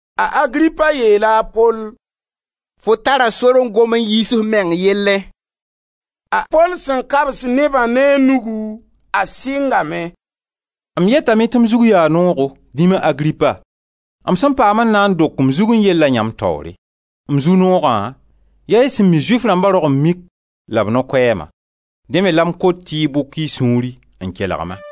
A Agripa yeela a Pol: «Fo tara sor n gom n yiis f meng yellẽ.» A Pol sẽn kabs nebã ne a nugu a sɩngame: «M yetame tɩ m zug yaa noogo, dĩma Agripa, m sẽn paam n na n dok m zugẽ yella yãmb taoore. M zu-noogã, yaa y sẽn mi Zʋɩf rãmba rog-n-mik la b no-koɛɛma. Dẽ me la m kot tɩ y bʋk y sũuri n kelg-ma.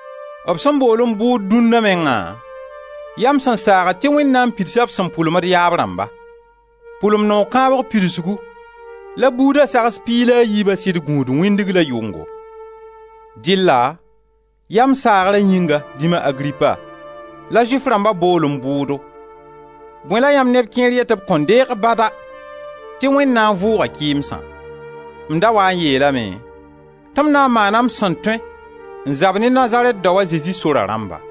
B sẽn bool-m bʋʋd dũnna mengã, yaa m sẽn saagd tɩ Wẽnd na n pidsa b sẽn pʋlem d yaab rãmba. Pʋlem noog kãng pidsgu la buuda sags piig la a yiiba sɩd gũud, wĩndg la yʋngo. Dɩlla ya m saagra yĩnga, dĩma Agripa, la Zʋɩf rãmba bool-m bʋʋdo. Bõe la yãmb neb kẽer yet tɩ b kõn deeg bada tɩ Wẽnd na n vʋʋga kɩɩmsã? M da waa n yeelame tɩ m na n maana m sẽn tõe n zab ne Nazarɛt dao, a Zezi, sora rãmba.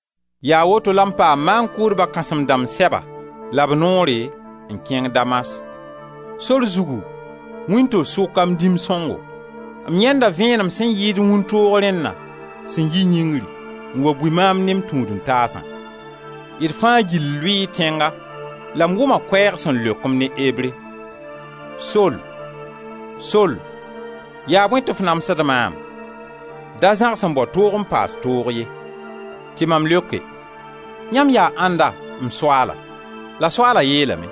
Yaa woto la m paam maan-kʋʋdba kãsem-dãmb sɛba la b noore n kẽng Damas. Sor zugu, wĩnto-sʋka, m dĩm sõngo, m yãenda vẽenem sẽn yɩɩd wĩntoog rẽnna sẽn yi yĩngri n wa bui maam ne m tũud-n-taasã. D fãa gill lʋɩɩ tẽnga la m wʋma koɛɛg sẽn leok-m ne Ebre: ‹Sol, Sol, yaa bõe tɩ f namsd maam? Da zãgs n bao toog n paas toog ye.› Tɩ mam leoke: ‹Yãmb yaa ãnda, m Soaala?› La Soaala yeelame: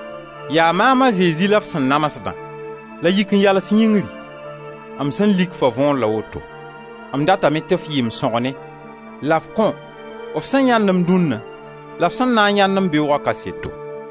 ‹Yaa maam a Zezi la f sẽn namsdã. La yik n yals yĩngri. M sẽn lik-fa võor la woto: m datame tɩ f yɩ m sõgne la f kõ f sẽn yãend-m dũnna la f sẽn na n yãend-m beooga kaseto.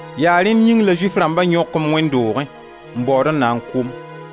Yaa rẽnd yĩng la Zʋɩf rãmba yõk-m wẽnd doogẽ n baood n na n kʋ-m.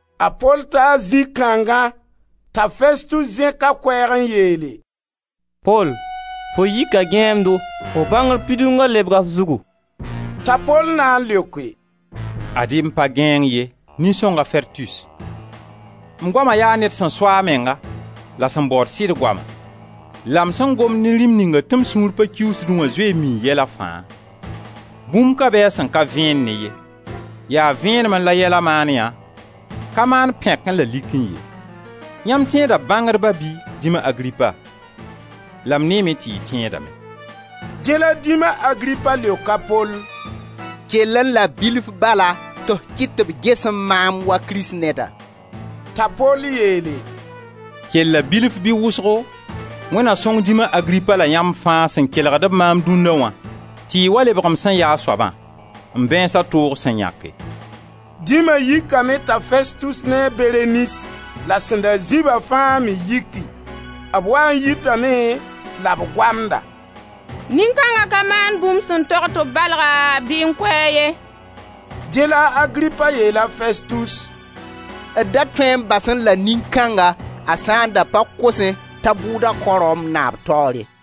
A Pol taa zĩ kãngã t'a Festus zẽk a koɛɛg n yeele: «Pol, fo yika gãeemdo, f bãngr pidunga lebga f zugu.» T'a Pol na n leoke: «Ad-y m pa gãeemd ye, nin-songa Festus, m goama yaa ned sẽn so a menga la sẽn baood sɩd goama. La m sẽn gomd ne rĩm ninga tɩ m sũur pa kiuusdẽ wã zoe n mii yɛla fãa; bũmb ka be a sẽn ka vẽen ne ye, yaa vẽenemẽ la yɛla maan yã, ka maan pẽkẽ la likẽ ye! Yãmb tẽeda bãngdba bɩ, dĩma Agripa? La m neeme tɩ y tẽedame.» Dẽ la dĩma Agripa leok a Pol: «Kellẽ la bilf bala tɩ f kɩt tɩ b gesẽ maam wa Kristneda!» T'a Pol yeele: «Kella bilf bɩ wʋsgo, Wẽnd na sõng dĩma Agripa la yãmb fãa sẽn kelgb maam dũnna wã, tɩ y wa lebg m sẽn yaa soabã, m bãeensa toog sẽn yãke.» Dĩma yikame t'a Festus ne a Berenis la sẽn da zĩ-ba fãa me yiki. B waa n yitame la b goamda: «Nin-kãnga ka maan bũmb sẽn tog tɩ b balga bɩ n kʋ-a ye.» Dẽ la a Agripa yeel a Festus: «D da tõe n basẽ la nin-kãnga a sã n da ka kosẽ t'a bʋʋda kaoẽ Rom naaba taoore.»